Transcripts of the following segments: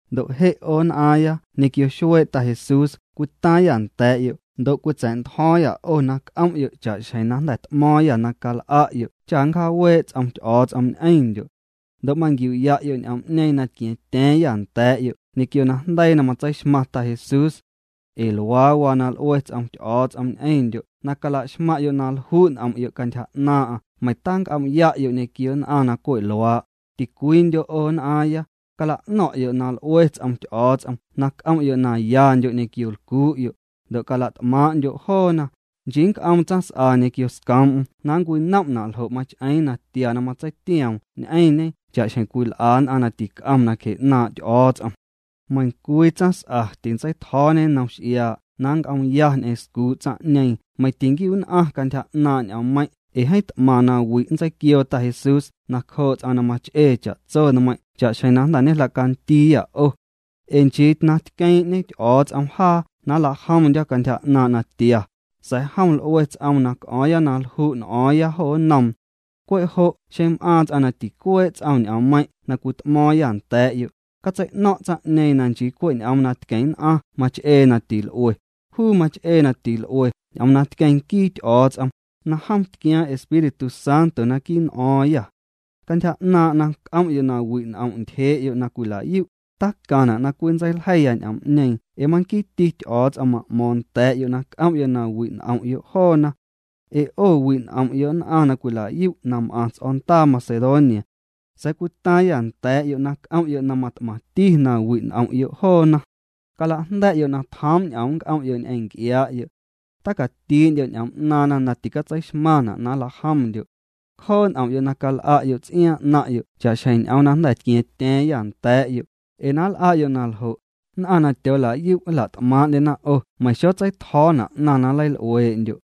Ndo' je' 'o nn'aaⁿya ñequio xuee' Ta Jesús cwitaaⁿyâ nda̱a̱'yo' ndo' cwitsa̱'ntjo̱o̱ⁿyâ 'o na c'om'yo' cha'xjeⁿ na jnda̱ t'mo̱o̱ⁿyâ na cal'a'yo' cha nncjaawee' ts'om Ty'o̱o̱ts'om ñ'eⁿndyo'. Ndo' manquiu'ya'yo' ñ'oom'ñeeⁿ na tqua̱a̱ⁿtya̱a̱ⁿyâ nda̱a̱'yo' ñequio najndeii na matseixmaⁿ Ta Jesús. Ee luaa waa na l'ue ts'om Ty'o̱o̱ts'om ñ'eⁿndyo' na calaxmaⁿ'yo' na lju' n'om'yo' cantyja 'naaⁿ'aⁿ meiⁿ tanc'om'ya'yo' ñequio nn'aⁿ na cwe' luaa', ticwiindyo' 'o nn'aaⁿya, cala'no̱ⁿ'yo' na l'ue ts'om Ty'o̱o̱ts'om na c'om'yo' na yandyo' ñequio lcuu'yo', ndo' na cala't'maaⁿ'ndyo' joona, nchii nnc'oom tsaⁿs'a ñequio scoom'm na ncwinom'na' ljo' mach'eeⁿ na tia na matseitioom ñ'eⁿñe cha'xjeⁿ cwil'a nn'aⁿ na tic'om nacje 'naaⁿ' Ty'o̱o̱ts'om. Meiⁿcwii tsaⁿs'a tintseitjo̱o̱ñe nnom x'iaa' na nnc'oomya ñ'eⁿ scuu' tsaⁿ'ñeeⁿ meiⁿ tinquiu'nn'aⁿ cantyja 'naaⁿ' ñ'oommeiⁿ' ee jeeⁿ t'maⁿ na wi' nntseiquioo Ta Jesús nacjoo' ts'aⁿ na mach'ee cha'tso nmeiⁿ' cha'xjeⁿ na jnda̱ ñejla'candiiyâ 'o. Ee nchii na tqueeⁿ'ñe Ty'o̱o̱ts'om jaa na nlajomndyo̱ cantyja 'naaⁿ' natia, sa̱a̱ jom l'ue ts'oom na c'o̱o̱ⁿya na lju' n'o̱o̱ⁿya jo nnoom. Cwe' jo' xeⁿ m'aaⁿ ts'aⁿ na ticuee' ts'om ñ'oommeiⁿ' na cwit'mo̱o̱ⁿyâ nda̱a̱'yo', catsei'no̱ⁿ' tsaⁿ'ñeeⁿ na nchii cwe' ñ'oom na tqueⁿ nn'aⁿ mach'ee na til'ue. Juu mach'ee na til'ue ñ'oom na tqueⁿ nquii Ty'o̱o̱ts'om, na jom tquiaaⁿ Espíritu Santo naquii' n'o̱o̱ⁿyâ. Cantyja 'naaⁿ' na c'om'yo' na wi' n'om ntyjee'yo' na cwila'yu', tacaⁿna' na cwinntseiljeiya ñ'oom'ñeeⁿ ee manquiiti Ty'o̱o̱ts'om ma'mo̱o̱ⁿ nda̱a̱'yo' na c'om'yo' na wi' n'om'yo' joona. Ee 'o wi' n'om'yo' nn'aⁿ na cwila'yu' na m'aⁿ ts'o̱ndaa Macedonia. Sa̱a̱ cwitaaⁿyâ nda̱a̱'yo' na c'om'yo' na mat'maⁿti na wi' n'om'yo' joona. Cala'jnda̱'yo' na tjoom' ñ'oom nnc'om'yo' ñ'eⁿ nc'iaa'yo'. Tacatii'ndyo' ñ'oom 'naaⁿna na ticatseixmaⁿna' na nla'jomndyo'. Cjoo' n'om'yo' na cal'a'yo' ts'iaaⁿ 'naⁿ'yo' cha'xjeⁿ ñ'oom na jnda̱ tqua̱a̱ⁿtya̱a̱ⁿyâ nda̱a̱'yo', ee na nl'a'yo' na ljo', nn'aⁿ na tyoola'yu' nla't'maaⁿ'ndyena 'o meiⁿ xotseitjo̱o̱na' 'naⁿ na nleil'uee'ndyo'.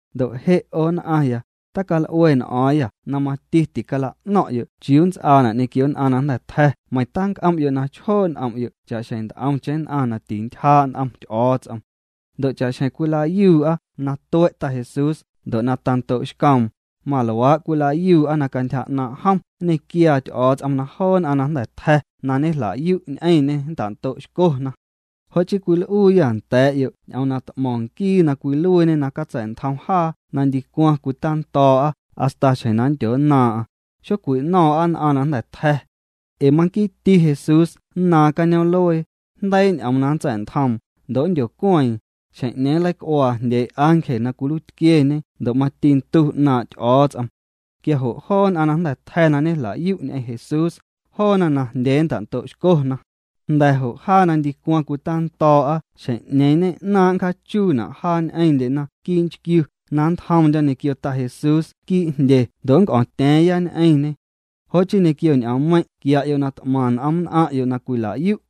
Ndo' je' 'o nn'aⁿya, tacal'ue n'o̱o̱ⁿyâ na mati ticala'no̱ⁿ'yo' chiuu nnts'aana' ñequio nn'aⁿ na jnda̱ tja̱ meiⁿ tanc'om'yo' na chjoo' n'om'yo' cha'xjeⁿ nt'omcheⁿ nn'aⁿ na tintyjaa' n'om Ty'o̱o̱ts'om. Ndo' cha'xjeⁿ cwila'yuu'a na tue' Jesús ndo' na tando'xcoom, maluaa' cwila'yuu'a na cantyja 'naaⁿ' jom nñequiaa Ty'o̱o̱ts'om na joo nn'aⁿ na jnda̱ tja̱ na ñejla'yu' ñ'eⁿñê nnta'ndo'xcona. Jo' chii cwil'uuyâ nda̱a̱'yo' ñ'oom na t'mo̱ⁿ nquii na cwiluiiñe na catsa̱'ntjom jaa na ndicwaⁿ cwitando̱o̱'a hasta xjeⁿ na nndyonnaaⁿ'aⁿ, xocwino̱o̱ⁿ'a nn'aⁿ na jnda̱ tja̱. Ee manquiiti Jesús nnaaⁿ cañoom'luee, jndeii' ñ'oom na nntsa̱'ntjoom, ndo' nndyocueeⁿ, xjeⁿ'ñeeⁿ nleic'uaa jndyee' ángel na cwiluiitquieñe ndo' mati ndu 'naaⁿ' Ty'o̱o̱ts'om. Quia jo' joo nn'aⁿ na jnda̱ tja̱ na ñejla'yu' ñ'eⁿ Jesús, joona najndyee nnta'ndo'xcona. Jnda̱ jo' jaa na ndicwaⁿ cwitando̱o̱'a xjeⁿ'ñeeⁿ ñe'naaⁿ' nncjaachuuna' jaa ñ'eⁿndyena quii' nchquiu na nntjomndyo̱ ñequio Ta Jesús quii' jndye ndo' nnc'o̱o̱ⁿtya̱a̱ⁿya ñ'eⁿñê. Jo' chii ñequio ñ'oommeiⁿ' quia'yo' na t'maⁿ n'om nn'aⁿ'yo' na cwila'yu'.